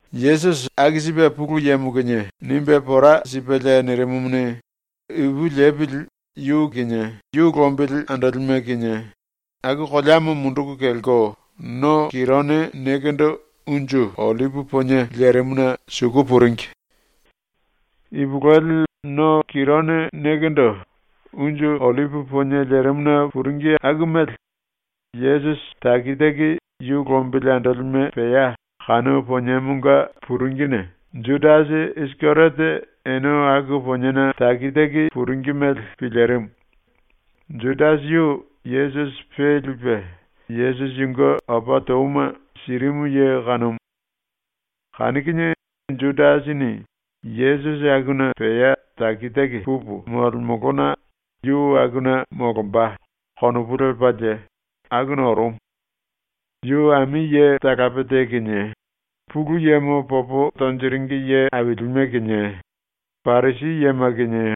Yesusi aku sipe Pulu Yemo kinie nimbe pora sipelie nirimumuni, ipu lepili yu kinie yu lombili andolime kinie aku koleamo munduku kelko no Kirone nekendo unju ollipi ponie lerimuna suku puringi. ⸤Ipulueli no Kirone nekendo unju ollipi ponie lerimuna puringi aku mele Yesusi taki taki yu lombili andolime pea kanu poniemonga puringine⸥ Judasi Isikeriote ene aku poniena puringi mele pilirimu. Judasi yu Yesusi pe lipe Yesusi yunge opa touma sirimu ye kanumu. Kanu kinie Judasini ⸤‘Yesusi akuna pea taki taki pupu molemolona yu akuna molomba.’ konopu lepalie,⸥ akuna orumu. Yu ami ye talape te kinie Pulu Yemo popo tonjiringi ye ailime kinie Parisi yema kinie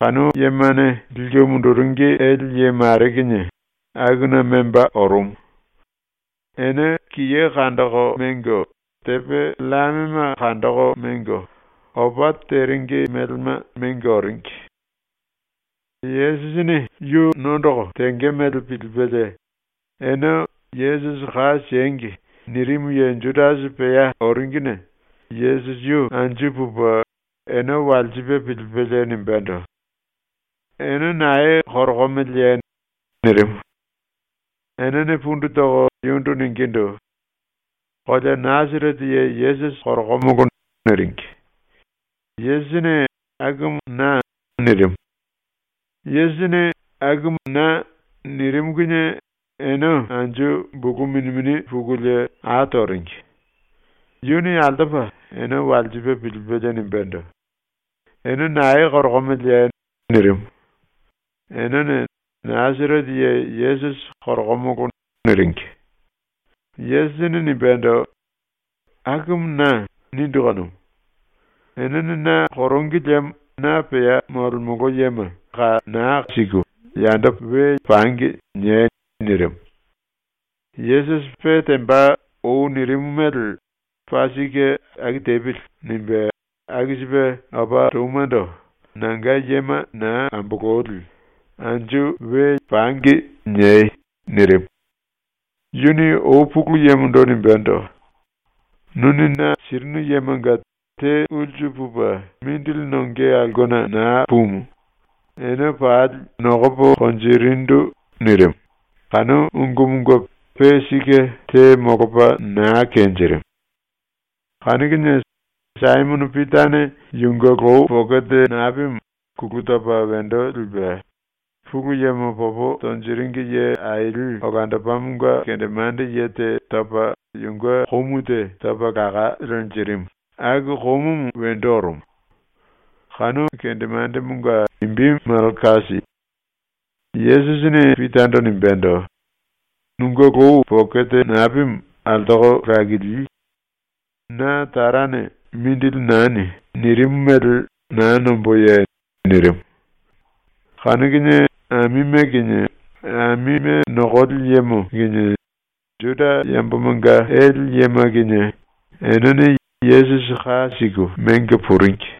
kanu yemane liku munduringi ele ye mare kinie akuna memba orumu. Ene kiye kandoko mengo, tepe llamema kandoko mengo, opa teringi melema mengo oringi. Yesusini yu nondoko tenge mele pilipelie, ene ‘Yesusi ka siengi.’ nirimu ye Judasi pea oringine Yesusi yu anju pupe ene walsipe pilipelie nimbendo: “Ene nae korokomeleye?” nirimu. Enene pundu toko yundu ningindu: “Kolea Nasarete ye Yesusi korokomolo.” niringi. Yesusini “Akumu na.” nirimu. Yesusini “Akumu na.” nirimu kinie ene anju bulu mini mini pukulie a toringi. Yuni altopa ene walsipe pilipelie nimbendo: “Ene nae korokomeleye?” nirimu. Enene “Nasarete ye Yesusi korokomolo.” niringi. Yesusini nimbendo: “ “Akumu na.” nindu kanumu. Enene na korongi liemo na pea molemolo yema ‘Naa ka siemili, yando pangi.’ niei.” nirimu. Yesusi pe temba ou nirimu mele ‘Paa sike aku tepili.’ nimbe aku sipe opa toumando “Nanga yema naa ambololi “Anju pangi.” niei.” nirimu. Yuni ou Pulu Yemondo nimbendo: “Nuni na sirinu yemanga te ulsu pupe mindili nonge aulkena naa pumu, ene pali nokopo konjirindu.” nirimu, kanu ungumunge pe sike te molopa naa kenjirimu. Kanu kinie Saimono Pitane yunge lou pokete napimu kulu topa wendo lipe Pulu Yemo popo tonjiringi ye aili olandopamonga kendemande ye te topa yunge komu te topa laka lenjirimu, aku komumu wendo orumu. Kanu kendemandemonga imbi Malkasi. Yesusini Pitando nimbendo: “Nunge lou pokete napimu altoko lakili! Na Tarane “Mindili nani.” nirimu mele naa nomboye?” nirimu. Kanu kinie amime kinie amime nokoli yemo kinie Juda yambomanga ele yema kinie enene Yesusi ka siku mengo puringi.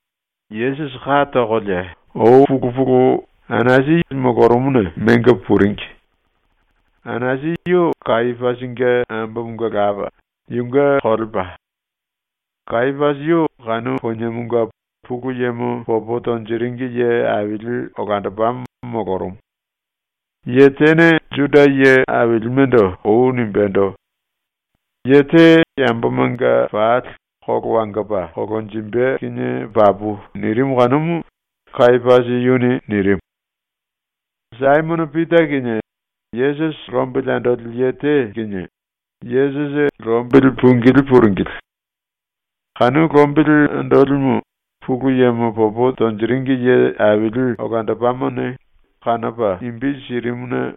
Yesusi ka tokolie ou pulu pulu Anasi molorumuna mengo puringi. Anasi yu Kayapasinge ambomonga lapa, yunge kolepa. Kayapasi yu kanu poniemonga Pulu Yemo popo tonjiringi ye aili olandopamo molorumu. Ye tene Juda ye ailimendo ou nimbendo: “Ye te yambomanga pali kolo wangopa kolonjimbe kinie papu.” nirimu kanumu Kayapasi yuni nirimu. Saimono Pita kinie Yesusi lombili andoli ye te kinie Yesusi lombili pungilí puringili. Kanu lombili andolimu Pulu Yemo popo tonjiringi ye aili olandopamone kanopa imbi sirimuna,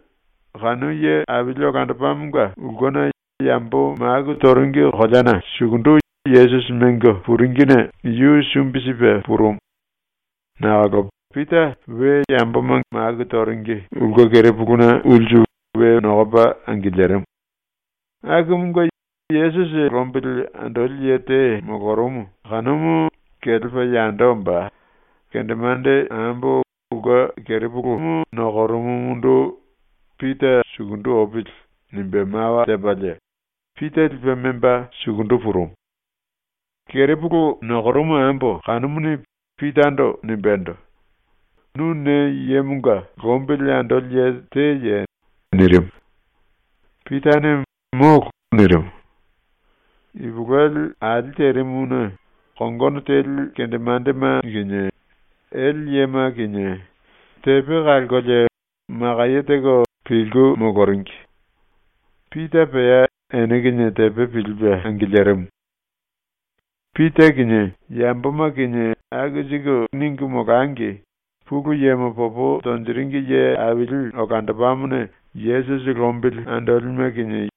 kanu ye aili olandopamonga ulkena yambo maku toringi koleana sukundu Yesusi mengo puringine yu sumbi sipe purumu nakolo Pita we yambo maku toringi ulke kerepuluna ulsu we nokopa angilirimu. Akumunge Yesusi lombili andoli ye te molorumu kanumu kelepa yando omba kendemande ambo ulke kerepulu nokorumumundu “Pita sukundu opili.” nimbe mawa tepalie Pita lipe memba sukundu purumu. Kerepulu nokorumu ambo kanumuni Pitando nimbendo: “Nu ne yemonga lombili andoli ye teye?” nirimu. Pitane “Molo.” nirimu. Ipulueli ali terimuna kongono teli kendemandema kinie ele yema kinie tepe kalkolie makaye teko pilku moloringi. Pita pea ene kinie tepe pilipe angilirimu. Pita kinie yamboma kinie aku siku ningu molangi Pulu Yemo popo tonjiringi ye aili olandopamone Yesusi lombili andolime kinie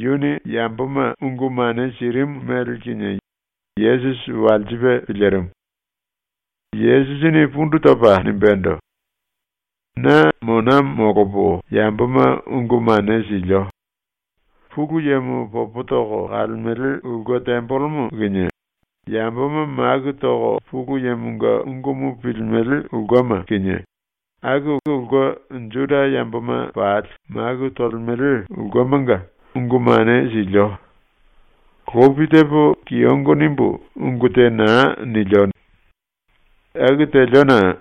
yuni yamboma ungu mane sirimu mele kinie Yesusi walsipe pilirimu. Yesusini pundu topa nimbendo: “Na mona molopo yamboma ungu mane silio. ⸤Pulu Yemo popo toko kalemele⸥ ulke tembelemo kinie, yamboma maku toko Pulu Yemonga ungumu pilimele ulkema kinie aku ulke Juda yamboma pali maku tolemele ulkemanga ungu mane silio. Lopi tepo kiyongo nimbu ungu te naa nilio.” nirimu. “Aku teliona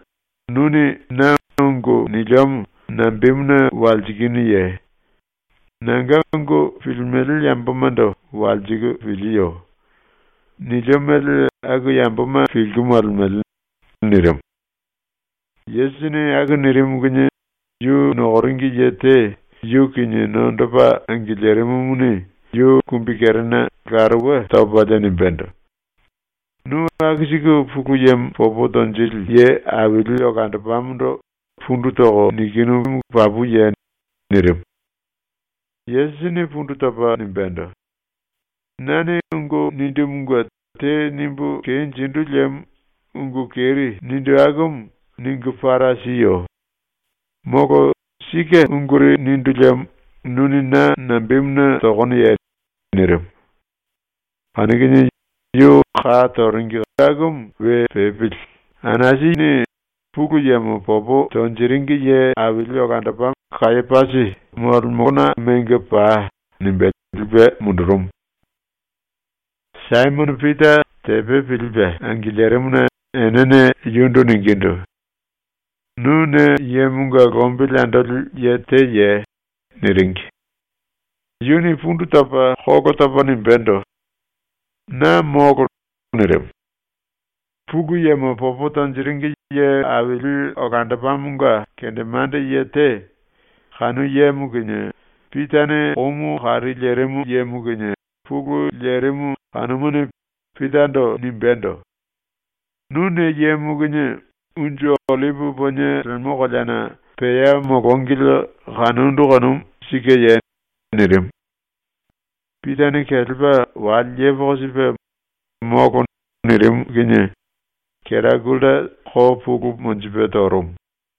nuni na ungu niliomo nambemuna walsikinuye? Nanga ungu pilimele yambomando walsiku pilieyo. Nilio mele aku yamboma pilku molemele.” nirimu. Yesusini aku nirimu kinie yu nokoringi ye te yu kinie nondopa angilirimumuni yu kumbikerena laruwe topalie nimbendo: “Nu aku siku Pulu Yemo popo tonjili ye aili olandopamondo pundu toko nikinu papuye?” nirimu. Yesusini pundu topa nimbendo: “Nane ungu nindumunge te nimbu kenjindu liemo ungu keri nindu akumu ningu para siyo. Molo sike unguri nindu liemo nuni na nambemuna tokonoye?” nirimu. Kanu kinie yu ka toringi akumu we pepili Anasini “Pulu Yemo popo tonjiringi ye aili olandopa Kayapasi molemona mengo pai.” nimbe lipe mundurumu. Saimono Pita tepe pilipe angilirimuna enene yundu ningindu: “Nu ne yemonga lombili andoli ye teye?” niringi. Yuni pundu topa ⸤kolo topa⸥ nimbendo: “Na molo.” nirimu. Pulu Yemo popo tonjiringi ye aili olandopamonga kendemande ye te, kanu yemo kinie Pitane komu kari lerimu yemo kinie pulu lerimu kanumuni Pitando nimbendo: “Nu ne yemo kinie unju ollipi ponie lemo koleana pea molongili kanondu kanumu sikeye?” nirimu. Pitane kelepa wale yepoko sipe “Molo.” nirimu kinie kera gulta ko pulu monjipe torumu.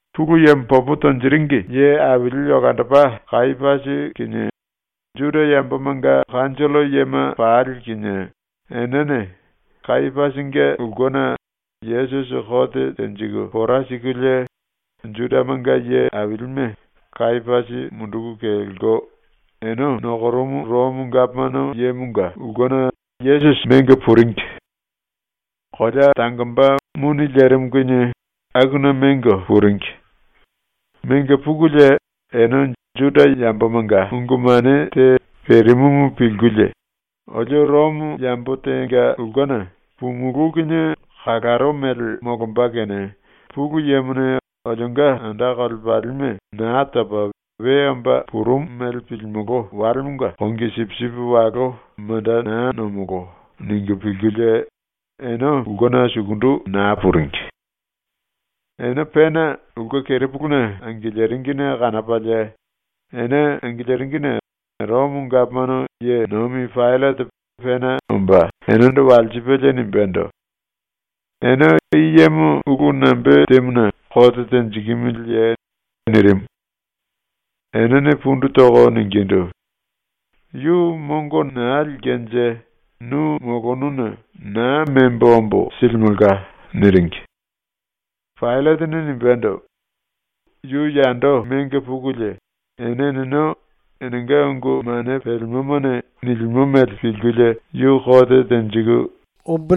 ⸤Pulu Yemo popo tonjiringi ye aili olandopa Kayapasi kinie Juda yambomanga kanjollo yema pali kinie enene Kayapasinge ulkena Yesusi kote tenjiku pora sikulie,⸥ Judamanga ye ailime Kayapasi munduku kelko ene nokorumu Romo gapomano yemonga ulkena Yesusi mengo puringi. Kolea tangomba muni lerimu kinie akuna mengo puringi. Mengo pukulie ene Juda yambomanga ungu mane te perimumu pilkulie ‘Olio Romo yambo tenga ulkena pumulú kinie kalaro mele molomba kene Pulu Yemone olionga anda kolepalime Naa Topa We Omba Purumu mele pilimolo walemonga kongi sipisipi walo manda naa nomolo.’ ningu pilkulie ene ulkena sukundu naa puringi. Ene pena ulke kerepuluna angiliringine kanopalie ene angiliringine Romo gapomano ye nomi Paillate pena omba enendo walsipelie nimbendo: “Ene i yemo ulu nambe temuna kote tenjikimiliye?” nirimu. Enene pundu toko ningindu: “Yu mongo naa lilkenje nu molonuna naa membo ombo silimelka.” niringi. Paillatene nimbendo: “Yu yando mengo pukulie ene eneno enenga ungu mane pelemomane nilimo mele pilkulie yu kote tenjiku mongo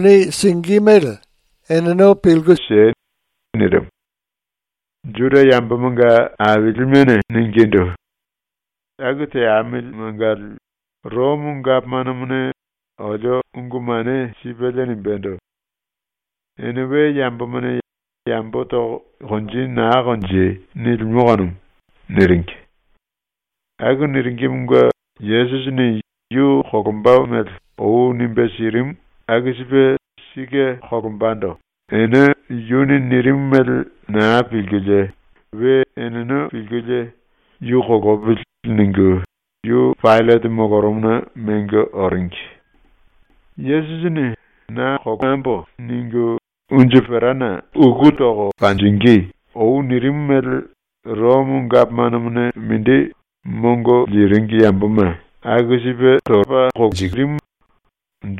siei.” nirimu. Juda ⸤yambomanga aili⸥ mene ningindu: “Aku teamili mangali Romo gapomanomone olio ungu mane sipelie nimbendo: “Ene we yambomane yambo toko konji naa konjei.” nilimo kanumu.” niringi. Aku niringimunge Yesusini yu kolomba mele ou nimbe sirimu aku sipe sike kolombando ene yuni nirimu mele naa pilkulie we eneno pilkulie “Yu kolopili.” ningu yu Paillate molorumuna mengo oringi. Yesusini “‘Na kolopili.’ ningu unju perana uku toko monjingí.” ou nirimu mele Romo gapomanomone mindi mongo liringi yamboma aku sipe torumu,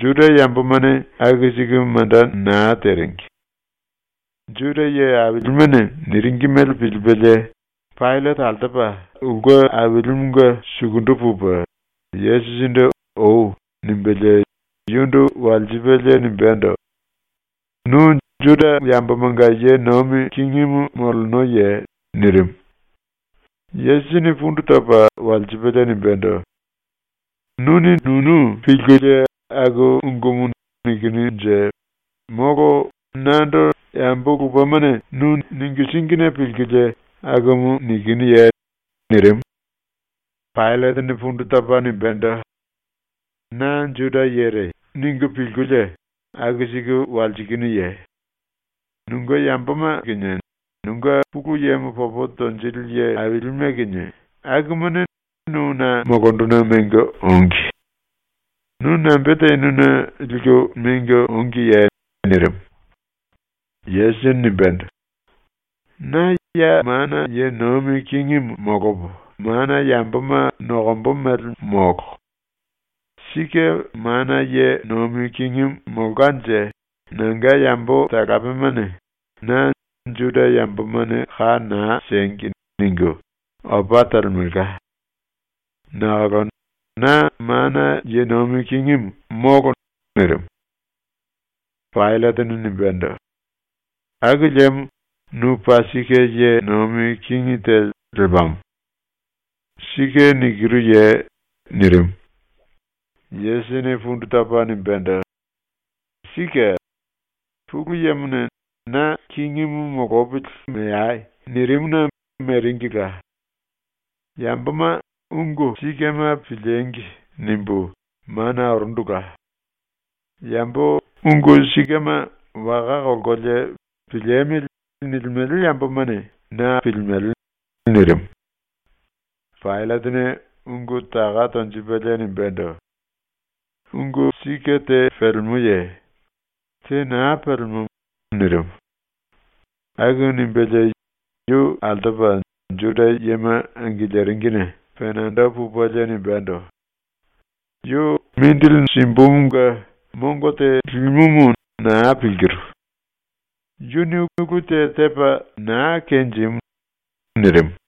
Juda yambomane aku siku manda naa teringi. Juda ye ailimene niringi mele pilipelie, Paillate altopa ulke ailimunge sukundu pupe Yesusindu “Ou.” nimbelie yundu walsipelie nimbendo: “Nu Juda yambomanga ye nomi kingimu molenoye?” nirimu. Yesusini pundu topa walsipelie nimbendo: “Nuni nunu pilkulie aku ungumu nikinunje molo nando yambo lupemane nu ningu síngine pilkulie akumu nikinuye?” nirimu. Paillatene pundu topa nimbendo: “Na ‘Juda yere.’ ningu pilkulie aku siku walsikinuye? Nunge yamboma kinie nunge Pulu Yemo popo tonjili ye ailime kinie akumane nu na molonduna mengo ongi. Nu nambe tenuna liku mengo ongiye?” nirimu. Yesusini nimbendo: “Na ya mana ye nomi kingimu molopo mana yamboma nokombo mele molo. Sike mana ye nomi kingimu molkanje nanga yambo talapemane na “Juda yambomane ka naa siengi.” ningu opa telemelka. Nakolo na mana ye nomi kingimu molo.” nirimu. Paillatene nimbendo: “Aku liemo nu paa sike ye nomi kingi te lepamo. Sike nikiruye?” nirimu. Yesusini pundu topa nimbendo: “Sike. Pulu Yemone ‘Na kingimu molopili meai.’ nirimuna meringila. ‘Yamboma ungu sikema piliengi!’ nimbu mana orundula. Yambo ‘ungu sikema’ waka kolkolie ‘piliemili.’ nilimele yambomane na pilimele.” nirimu. Paillatene ⸤ungu taka tonjipelie⸥ nimbendo: “Ungu sike te pelemoye? Te naa pelemo.” nirimu. Aku nimbelie yu altopa Juda yema angiliringine penando pupelie nimbendo: “Yu mongo simbumunge mongo te limumu naa pilkiru. Yuni ulu te tepa naa kenjimu.” nirimu.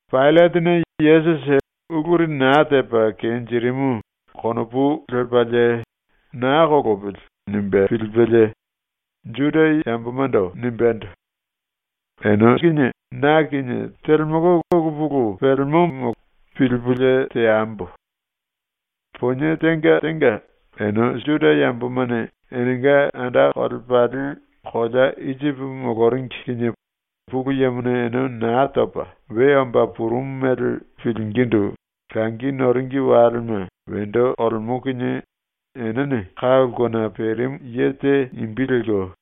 Paillatene ⸤Yesusi uluri naa tepa kenjirimu konopu lepalie ‘Naa kolopili.’ nimbe pilipelie⸥ Juda yambomando nimbendo: “Ene kinie na kinie telemolo ulu pulu pelemomo pilipulie teambo. Ponie tenga tenga, ene Juda yambomane enenga anda kolepali kolea Isipi moloringi kinie Pulu Yemone ene Naa Topa We Omba Purumu mele pilingindu langi noringi walema wendo olemo kinie enene ka ulkena perimu ye te imbi lelko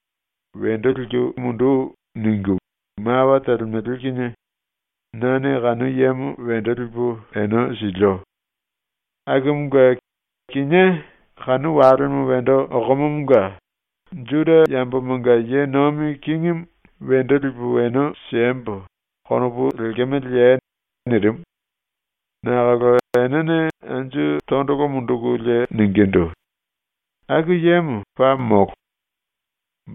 ‘Wendo liku mundu.’ ningu mawa telemele kinie nane kanu yemo wendo lipu ene silio. Akumunge kinié kanu walemo wendo okomomonga ‘Juda yambomanga ye nomi kingimu wendo lipu ene siembo.’ konopu lekemeleye?” nirimu. Nakolo enene anju tondolo mundukulie ningindu: “Aku yemo paa molo.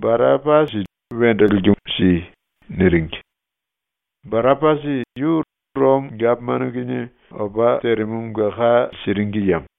Barapasi wendo liku si!” niringi. (Barapasi yu Romo gapomano kinie opa terimumunge ka siringi yemo.)